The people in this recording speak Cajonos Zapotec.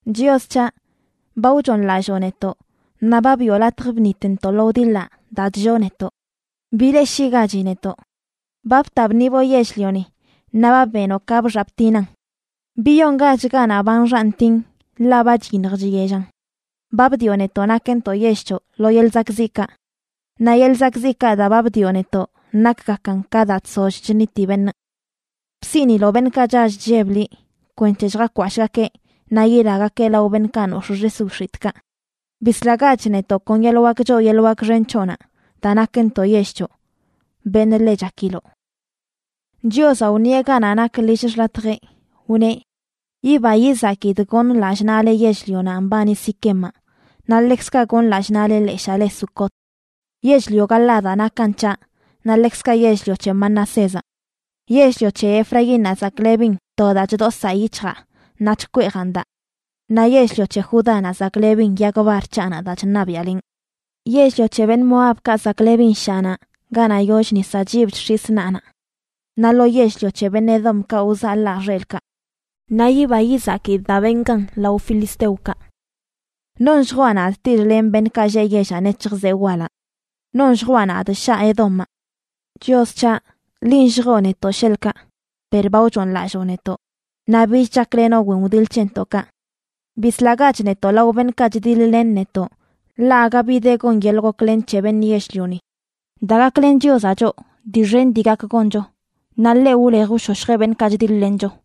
Chios c̱haꞌ, ba wchooṉlalloo netoꞌ, naꞌ ba biꞌo latj bṉitntoꞌ lo wdiḻaꞌ daa chlloo netoꞌ. ¡Bileꞌshiꞌgachi netoꞌ! Ba bta bṉiboꞌ yell-lioni naꞌ ba benoꞌ ka bxaꞌ btinan. Biyongach ganaꞌ ba nxaꞌ ntin, ḻaꞌ ba chyiṉj chyellan. Ba bdioꞌ netoꞌ nakntoꞌ yell c̱hoꞌ lo yelꞌ zakꞌziꞌkaꞌ. Naꞌ yeḻꞌ zakꞌziꞌkaꞌ daa ba bdioꞌ netoꞌ nakgakan ka daa chsoll chṉiti beṉꞌ. Bsiꞌniloꞌ beṉꞌkaꞌ chall chlleb liꞌ kwenc̱he lljakwashꞌgakeꞌ naꞌ yilagakeꞌ lao beṉꞌkaꞌ nox̱ꞌ xis wix̱itꞌkaꞌ. Bislagach netoꞌ kon yeḻꞌ wak choo yeḻꞌ wak xen c̱hoꞌnaꞌ daa nakntoꞌ yell c̱hoꞌ, beṉꞌ ḻe chakiloꞌ. Chiozaꞌ wṉieꞌ ganaꞌ nak lill xḻatjeꞌ, wneꞌ: “Yiba yizakidꞌ gonꞌ lallꞌ naꞌle yell-lionaꞌ mbani Siquemaꞌ, naꞌ ḻekzkaꞌ gonꞌ lallꞌ naꞌle leshaa le Sucot. Yell-lio Galaadaꞌ nakan c̱haꞌ, naꞌ ḻekzkaꞌ yell-lio c̱he Manasézaꞌ. Yell-lio c̱he Efraínnaꞌ zaklebin to daa chdosaa yic̱hjaa naꞌ chkweejan daa; naꞌ yell-lio c̱he Judánaꞌ zaklebin yag bar c̱haꞌnaꞌ daa chṉabiaꞌlenꞌ. Yell-lio c̱he beṉꞌ Moabkaꞌ zaklebin shaꞌnaꞌ ganaꞌ yoll nisaꞌ chyib chx̱isꞌ naꞌnaꞌ; naꞌ lo yell-lio c̱he beṉꞌ Edomkaꞌ wzaḻaa xelꞌkaꞌ, naꞌ yiba yizakidꞌ daa benꞌ gan lao beṉꞌ filisteokaꞌ.” ¿Non lljwaꞌ nadꞌ tiḻ-lenꞌ beṉꞌkaꞌ lleꞌ yellaꞌ nec̱hj zee walaꞌ? ¿Non lljwaꞌ nadꞌ shaꞌ Edomaꞌ? Chios c̱haꞌ, linꞌ lljoo netoꞌ sheḻꞌkaꞌ, per ba wchooṉlalloo netoꞌ, naꞌ bich chaklenoꞌ wen wdiḻ c̱hentoꞌkaꞌ. Bislagach netoꞌ lao beṉꞌkaꞌ chdiḻ-len netoꞌ, ḻaꞌ aga bi de gon yeḻꞌ goklen c̱he beṉꞌ yell-lioni. Daa gaklen Chiozaꞌ choꞌ, dii xen dii gak goncho, naꞌ ḻeꞌ wlej wshoshjeꞌ beṉꞌkaꞌ chdiḻ-lencho.